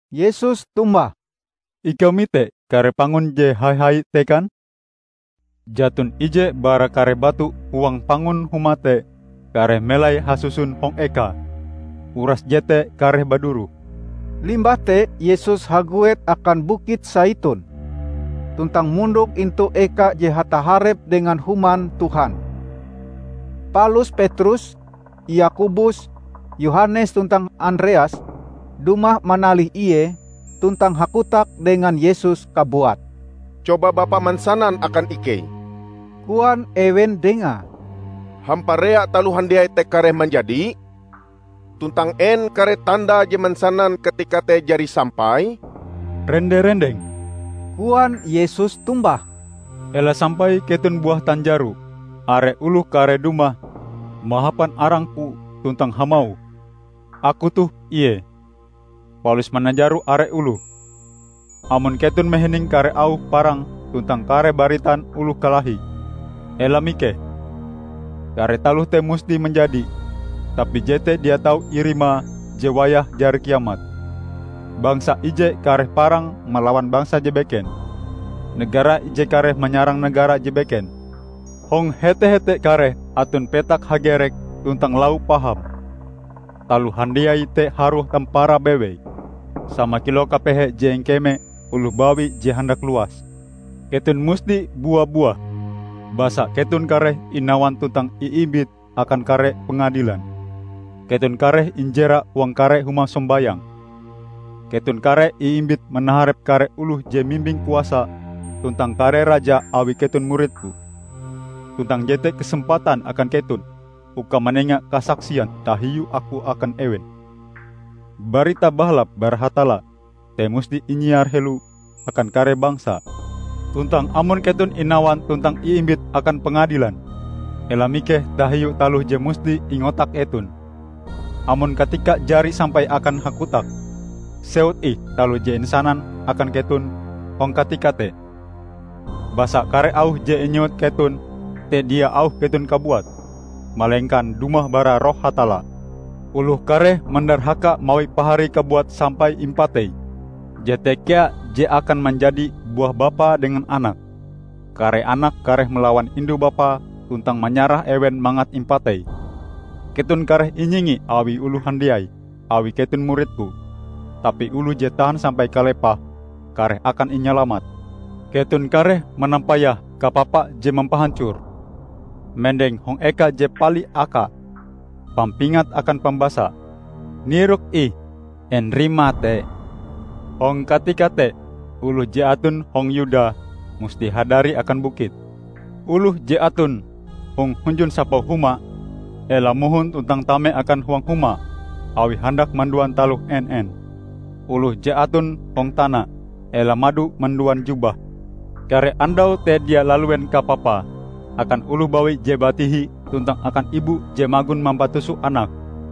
Yesus tombah, "Ikau mite kare pangun je hai-hai te kan? Jaton ije bara kare batu huang pangun Huma te kareh melai hasuson hong ekae. Uras jete kareh baduroh." Limbah te Yesus haguet akan Bukit Saitun, tuntang mondok intu eka je hataharep dengan Human Tuhan. Palus Petrus, Yakobus, Yohanes tuntang Andreas dumah manalih Ie tuntang hakotak dengan Yesus kabuat. "Coba Bapa mansanan akan ikei," koan ewen Dengae, "Hamparea taloh handiai te kareh manjadi? Tuntang en kare tandae je mansanan katikae te jari sampai?" "Rende-rendeng," koan Yesus tombah, "ela sampai keton buah tanjaro. Are oloh kareh dumah mahapan arang-Ku tuntang hamauh, 'Aku toh Ie!' palus mananjaro are oloh. Amon keton mahining kare auh parang tuntang kare baritan oloh kalahi, ela mikeh. Kare taloh te musti manjadi, tapi jete dia tau irima je wayahe jari kiamat. Bangsa ije kareh parang malawan bangsa je beken. Negara ije kareh manyarang negara je beken. Hong hete-hete kareh aton petak hagerek tuntang lau paham. Taloh handiai te harue tamparae bewei, sama kilau kapehe je ingkeme oloh bawi je handak luas. Keton musti bua-buah, basa keton kareh inawan tuntang iimbit akan kare pengadilan. Keton kareh injera huang kare huma sombayang. Keton kareh iimbit manaharep kare oloh je mimbing kuasa tuntang kare raja awi keton murid-Ku. Tuntang jete kesempatan akan keton uka manenga kasaksian tahiu Aku akan ewen. Barita Bahalap bara Hatalla te musti inyiar helo akan kare bangsa. Tuntang amon keton inawan tuntang iimbit akan pengadilan, ela mikeh tahiu taloh je musti ingotak keton. Amon katikae jari sampai akan hakotak, sewut ih taloh je insanan akan keton hong katika te. Basa kare auh je inyewut keton te dia auh keton kabuat, malengkan dumah bara Roh Hatalla. Oloh kareh mandarhaka mawi paharie kabuat sampai impatei. Jete kea je akan manjadi buah bapae dengan anake. Kare anak kareh malawan indu-bapae, tuntang manyarah ewen mangat impatei. Keton kareh inyingi awi oloh handiai awi keton murid-Ku. Tapi oloh je tahan sampai kalepahe, kareh akan inyalamat." "Keton kareh manampayah 'Kapapa je mampahancor' mendeng hong eka je pali akae. (Pampingat akan pambasa: Nirok ih en rimae te!) Hong katika te oloh je aton hong Yuda musti hadari akan bukit. Oloh je aton hong hunjun sapau huma ela mohon tuntang tame akan huang huma awi handak manduan taloh en-en. Oloh je aton hong tana ela mado manduan jubahe. Kare andau te dia laluen kapapae akan oloh bawi je batihi tuntang akan ibu je magon mampatuso anake!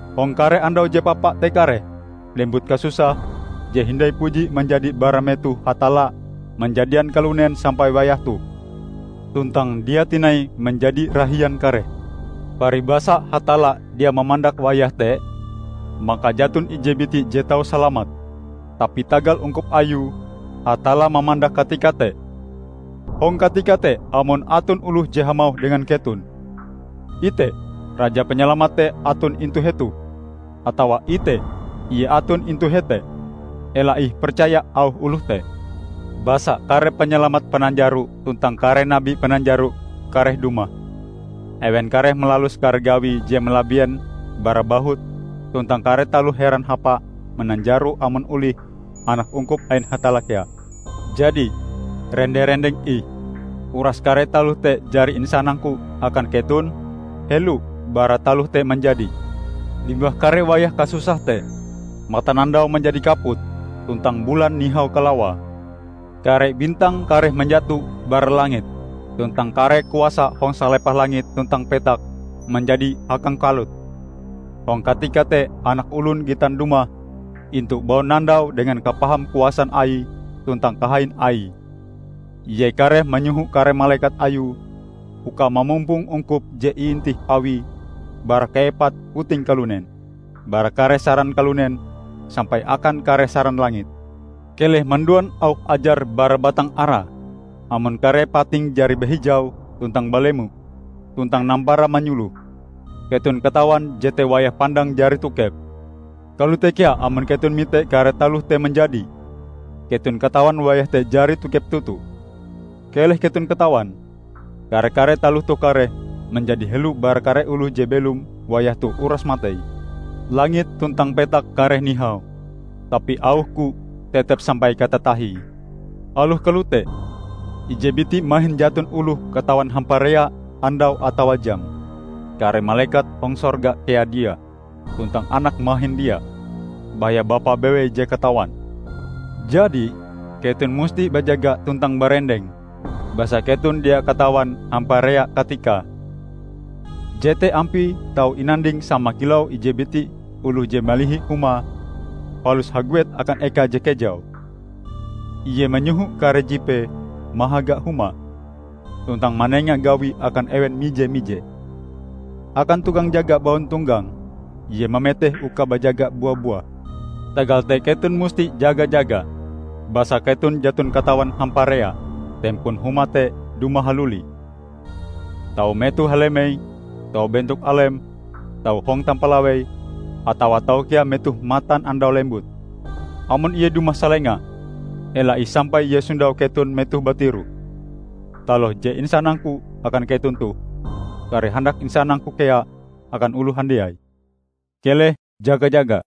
Hong kare andau je papa te kareh lembut kasusah je hindai puji manjadi bara metoh Hatalla manjadian kalunen sampai wayah toh, tuntang dia tinai manjadi rahian kareh. Paribasae Hatalla dia mamandak wayah te, maka jaton ije biti je tau salamat. Tapi tagal ungkup Ayue, Hatalla mamandak katika te. Hong katika te amon aton oloh je hamauh dengan keton, 'Ite, Raja Panyalamat te aton intu hetoh!' atawa 'Ite, Ie aton intu hete!' ela ih percaya auh oloh te. Basa kare panyalamat pananjaro tuntang kare nabi pananjaro kareh dumah. Ewen kareh malalus kare gawi je malabien bara bahut tuntang kare taloh heran hapae mananjaro amon olih, anak ungkup ain Hatalla kea. Jadi, rende-rendeng ih! Uras kare taloh te jari insanang-Ku akan keton helo bara taloh te manjadi." "Limbah kare wayah kasusah te, matanandau manjadi kaput, tuntang bulan nihau kalawae. Kare bintang kareh manjato bara langit, tuntang kare kuasa hong salepah langit tuntang petak manjadi hakangkalut. Hong katika te Anak Olon gitan dumah intu baunandau dengan kapaham kuasan Aie tuntang kahain Aie. Ie kareh manyoho kare malekat Ayue uka mamumpong ungkup je iintih Awie bara kaepat puting kalunen, bara kare saran kalunen sampai akan kare saran langit." "Keleh manduan auh ajar bara batang ara. Amon kare patinge jari bahijau tuntang balemo, tuntang nampara manyuloh, keton katawan jete wayah pandang jari tokep. Kalote kea amon keton mite kare taloh te manjadi, keton katawan wayah te jari tokep toto. Keleh keton katawan! Kare-kare taloh toh kareh manjadi helo bara kare oloh je belom wayah toh uras matei. Langit tuntang petak kareh nihau, tapi auh-Ku tetep sampai katatahie." "Aloh kalote, ije biti mahin jaton oloh katawan hamparea andaue atawa jame. Kare malekat hong sorga kea dia, tuntang Anak mahin dia, baya Bapa bewei je katawan. Jadi keton musti bajaga tuntang barendeng, basa keton dia katawan hamparea katikae. Jete ampie tau inanding sama kilau ije biti oloh je malihi humae palus haguet akan eka je kejau. Ie manyoho kare jipee mahaga humae, tuntang manenga gawi akan ewen mije-mije. Akan tukang jaga baun tonggang, ie mameteh uka bajaga bua-buah. Tagal te keton musti jaga-jaga, basa keton jaton katawan hamparea Tempon huma te dumah haluli -- tau metoh halemei, tau bentok alem, tau hong tampalawei, atawa tau kea metoh matan andau lembut. Amon ie dumah salenga, ela ih sampai ie sondau keton metoh batiroh. Taloh je insanang-Ku akan keton toh, kareh handak insanang-Ku kea akan oloh handiai: keleh jaga-jaga!"